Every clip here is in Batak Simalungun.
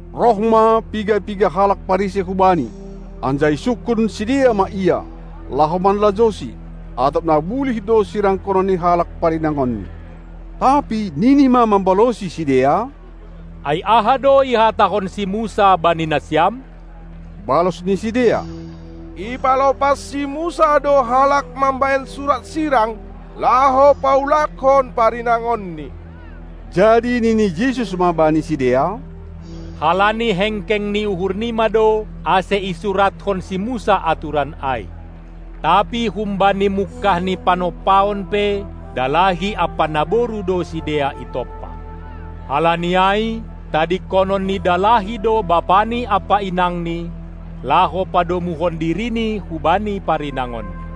Roh ma piga-piga halak Parisei hu Bani, anjaha isungkun sidea ma Ia, laho manlajouSi, atap na bulih do sirangkonon ni halak parinangonni. Tapi nini ma mambalosi sidea: Ai aha do ihatahon si Musa bani nasiam? Balos ni sidea: Ipalopas si Musa do halak mambahen surat sirang, laho paulakkon parinangonni. Jadi nini Jesus ma bani sidea: Halani hengkeng ni uhurnima do, ase isuratkon si Musa aturan ai. Tapi humbani mungkah ni panompaon pe dalahi ampa naboru do sidea itompa. Halani ai tadingkonon ni dalahi do bapani ampa inangni, laho padomuhon dirini hubani parinangonni.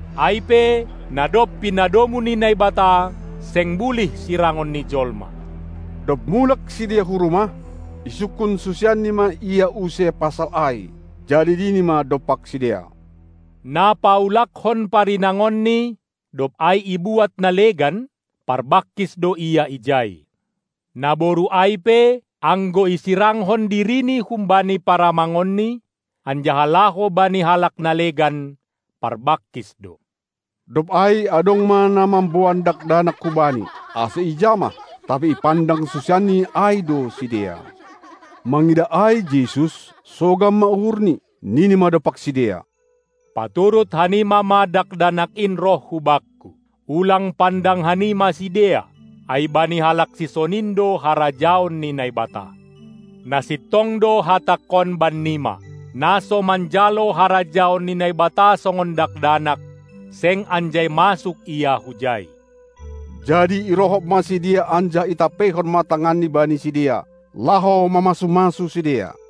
Ai pe, na dob pinadomu ni Naibata, seng bulih sirangon ni jolma. Dob mulak sidea hu rumah, isungkun susianNi ma Ia use pasal ai. Jadi nini ma dompak sidea: Na paulakkon parinangonni, dob ai ibuat na legan, parbangkis do ia ijai. Naboru ai pe, anggo isirangkon dirini humbani paramangonni, anjaha laho bani halak na legan, parbangkis do. Dob ai adong ma na mamboan dakdanak hu Bani, ase ijamah, tapi ipandang susianNi ai do sidea. Mangidah ai Jesus, sogam ma uhurNi, nini ma dompak sidea: Paturut hanima ma dakdanak in roh hu Bakku, ulang pandang hanima sidea, ai bani halak sisonin do harajaon ni Naibata. Na sintong do Hatangkon bannima: Na so manjalo harajaon ni Naibata songon dakdanak, seng anjai masuk ia hujai. Jadi irohop ma sidea anjaha itampeihon ma tanganNi bani sidea, laho mamasu-masu sidea.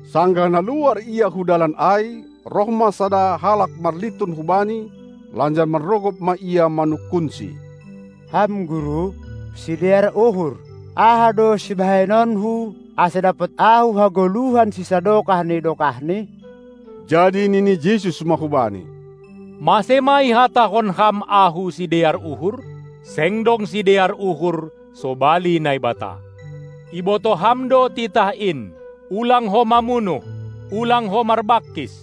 Sanggah na luar Ia hu dalan ai, roh ma sada halak marlintun hubani, lanjar manrogop ma ia manungkunSi: Ham Guru, sidear uhur! Aha do sibahenonku, ase dapot ahu hagoluhan sisadokah ni dokahni? Jadi nini Jesus ma hubani: Mase ma ihatahon ham Ahu sidear uhur? Seng dong sidear uhur sobali Naibata. Ibotoh ham do titah in: Ulang ho mamunuh! Ulang ho marbangkis!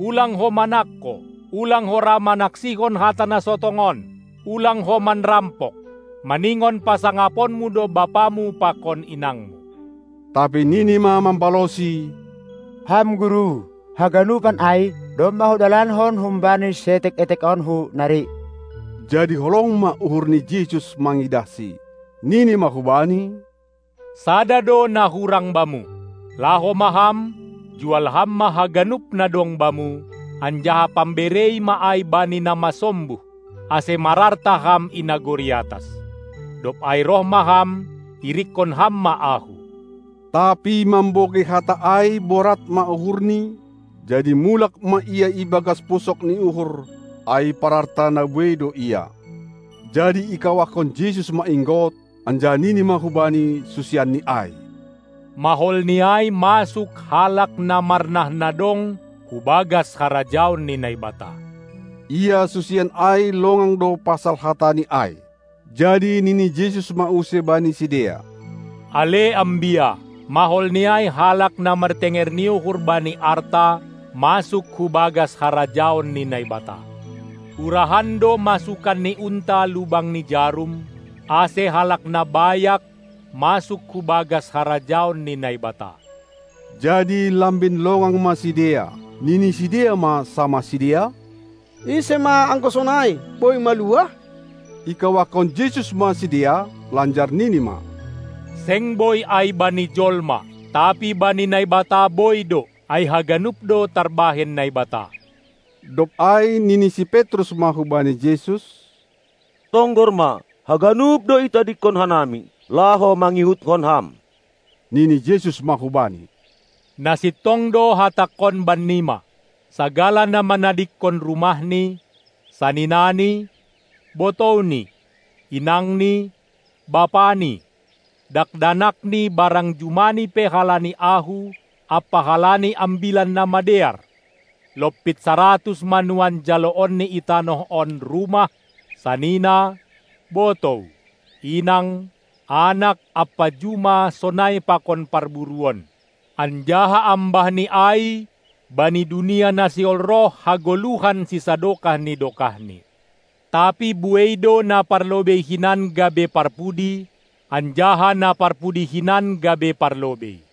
Ulang ho manangko! Ulang ho ra manaksihon hata na so tongon! Ulang ho manrampok! Maningon pasangaponmu do bapamu pakon inangmu! Tapi nini ma mambalosi: Ham guru! Haganupan ai domma hudalankon humbani sietek-etekonku nari. Jadi holong ma uhur ni Jesus mangidahSi, nini ma hubani: Sada do na hurang bamu. Laho ma ham, jual ham ma haganup na dong bamu, anjaha pamberei ma ai bani na masombuh, ase mararta ham i nagori atas. Dob ai roh ma ham, irikkon ham ma Ahu! Tapi mambogei hata ai borat ma uhurni, jadi mulak ma ia ibagas pusok ni uhur, ai pararta na buei do ia. Jadi ikawahkon Jesus ma inggot, anjaha nini ma hubani susianNi ai: Mahol ni ai masuk halak na marnah na dong hu bagas harajaon ni Naibata. Ia susian ai longang do pasal hata ni ai. Jadi nini Jesus ma use bani sidea: Ale ambia! Maholni ai halak na martenger ni uhur bani arta masuk hu bagas harajaon ni Naibata! Urahan do masukan ni unta lubang ni jarum, ase halak na bayak masuk hu bagas harajaon ni Naibata. Jadi lambin longang ma sidea, nini sidea ma samah sidea: Ise ma, anggo sonai, boi maluah? Ikawahkon Jesus ma sidea, lanjar nini ma: Seng boi ai bani jolma, tapi bani Naibata boi do! Ai haganup do tarbahen Naibata. Dob ai nini si Petrus ma hubani Jesus: Tonggor ma, haganup do itadingkon hanami, laho mangihutkon Ham! Nini Jesus ma hubani: Na sintong do Hatangkon bannima: Sagala na manadingkon rumahni, saninani, botouni, inangni, bapani, dakdanakni barang jumani pe halani Ahu ampa halani Ambilan Namadear, lompit saratus ma nuan jaloonni i tanoh on rumah, sanina, botou, inang, anak ampa juma sonai pakon parburuon; anjaha ambahni ai bani dunia na sihol roh hagoluhan sisadokah ni dokahni. Tapi buei do na parlobei hinan gabe parpudi, anjaha na parpudi hinan gabe parlobei.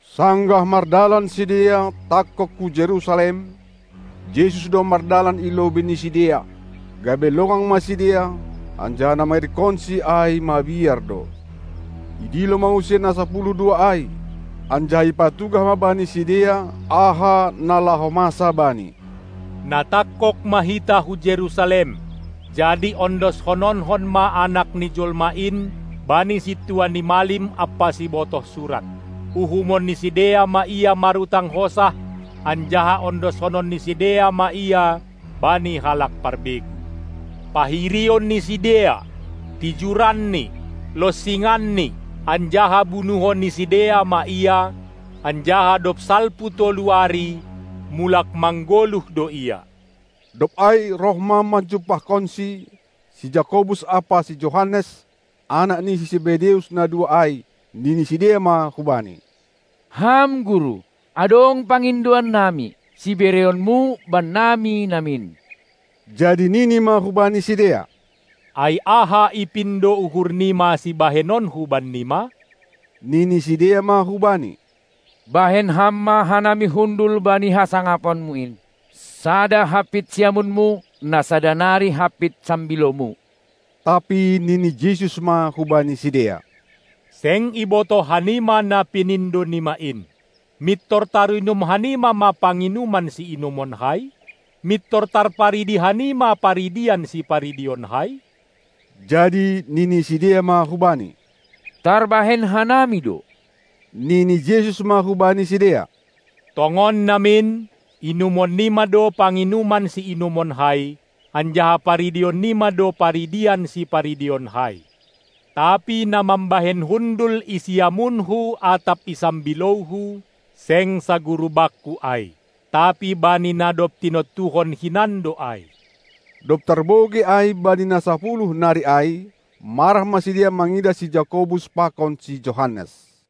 Sanggah mardalan sidea, tangkog hu Jerusalem, Jesus do mardalan i lobei ni sidea, gabe longang ma sidea, anjaha na mangirikkonSi ai mabiar do. Idilo ma use na sapuluh dua ai, anjaha ipatugah ma bani sidea, aha na laho masa Bani. Na tangkog ma hita hu Jerusalem, jadi ondoshononkon ma Anak ni jolma in bani sintua ni malim ampa sibotoh surat. Uhumon ni sidea ma Ia marutang hosah, anjaha ondoshonon ni sidea ma Ia bani halak parbegu. Pahirion ni sidea, tijuranni, lonsinganni, anjaha bunuhon ni sidea ma Ia, anjaha dob salpu tolu ari mulak manggoluh do Ia. Dob ai roh ma manjumpahkonSi, si Jakobus ampa si Johannes, anak ni si Sebedeus na dua ai, nini sidea ma hu Bani: Ham guru, adong pangindoan nami, sibereonMu bannami namin. Jadi nini ma hubani sidea: Ai aha ipindo uhur nima sibahenonKu bannima? Nini sidea ma hu Bani: Bahen Ham ma hanami hundul bani hasangaponMu in, sada hampit siamunMu, na sada nari hampit sambilouMu. Tapi nini Jesus ma hubani sidea: Seng ibotoh hanima na pinindo nima in. Mintor tarinum hanima ma panginuman siinumonKai? Mintor tarparidi hanima paridian siparidionKai? Jadi nini sidea ma hu Bani: Tarbahen hanami do. Nini Jesus ma hubani sidea: Tongon namin, inumon nima do panginuman siinumonKai, anjaha paridion nima do paridian siparidionKai, tapi na mambahen hundul i siamunHu atap i sambilouHu, seng saguru Bakku ai, tapi bani na dob tinontuhon hinan do ai. Dob tarbogei ai bani na sapuluh nari ai, marah ma sidea mangidah si Jakobus pakon si Johannes.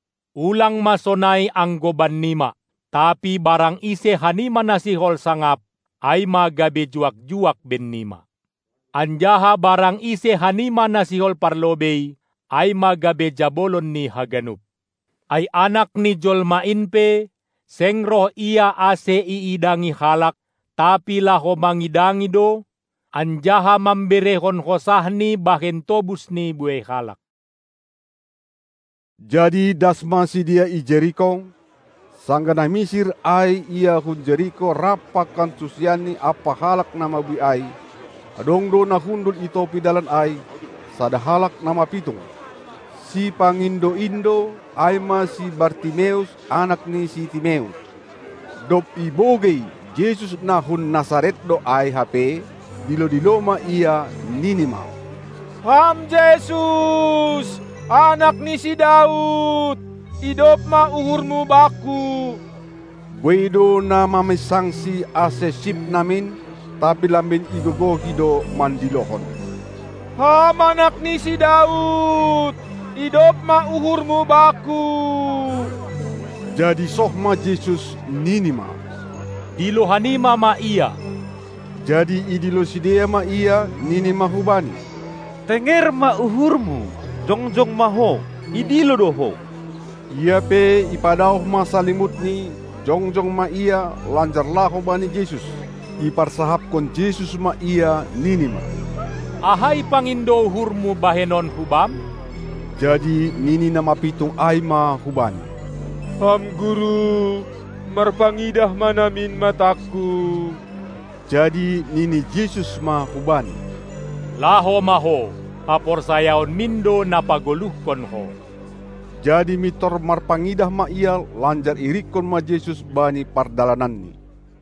Ulang ma sonai anggo bannima! Tapi barang ise hanima na sihol sangap, ai ma gabe juak-juak bennima! Anjaha barang ise hanima na sihol parlobei, ai ma gabe jabolon ni haganup. Ai Anak ni jolma in pe, seng roh Ia ase iidangi halak, tapi laho mangidangi do, anjaha mamberehon hosahNi bahen tobus ni buei halak. Jadi das ma sidea i Jeriko. Sanggah na misir ai Ia hun Jeriko rap pakon susianNi ampa halak na mabuei ai, adong do na hundul i topi dalan ai, sada halak na mapitung, sipangindo-indo, ai ma si Bartimeus, anak ni si Timeus. Dob ibogei, Jesus na hun Nasaret do ai hape, dilo-dilo ma ia, nini ma: Ham Jesus, Anak ni si Daud, idop ma uhurMu bakku! Buei do na maminsangsi ase sip namin, tapi lambin igogohi do mandilohon: Ham Anak ni si Daud, idop ma uhurMu bakku! Jadi soh ma Jesus, nini ma: Dilo hanima ma ia! Jadi idilo sidea ma ia, nini ma hubani: Tenger ma uhurmu, jongjong ma ho, idilo do ho! Ia pe ipadaoh ma salimutni, jongjong ma ia, lanjar laho bani Jesus. Iparsahapkon Jesus ma ia, nini ma: Aha ipangindo uhurmu bahenonKu bam? Jadi nini na mapitung ai ma hu Bani: Ham Guru, marpangidah ma namin matangku! Jadi nini Jesus ma hubani: Laho ma ho! Haporsayaonmin do na pagoluhkon ho! Jadi mintor marpangidah ma ia, lanjar iirikkon ma Jesus bani pardalananni.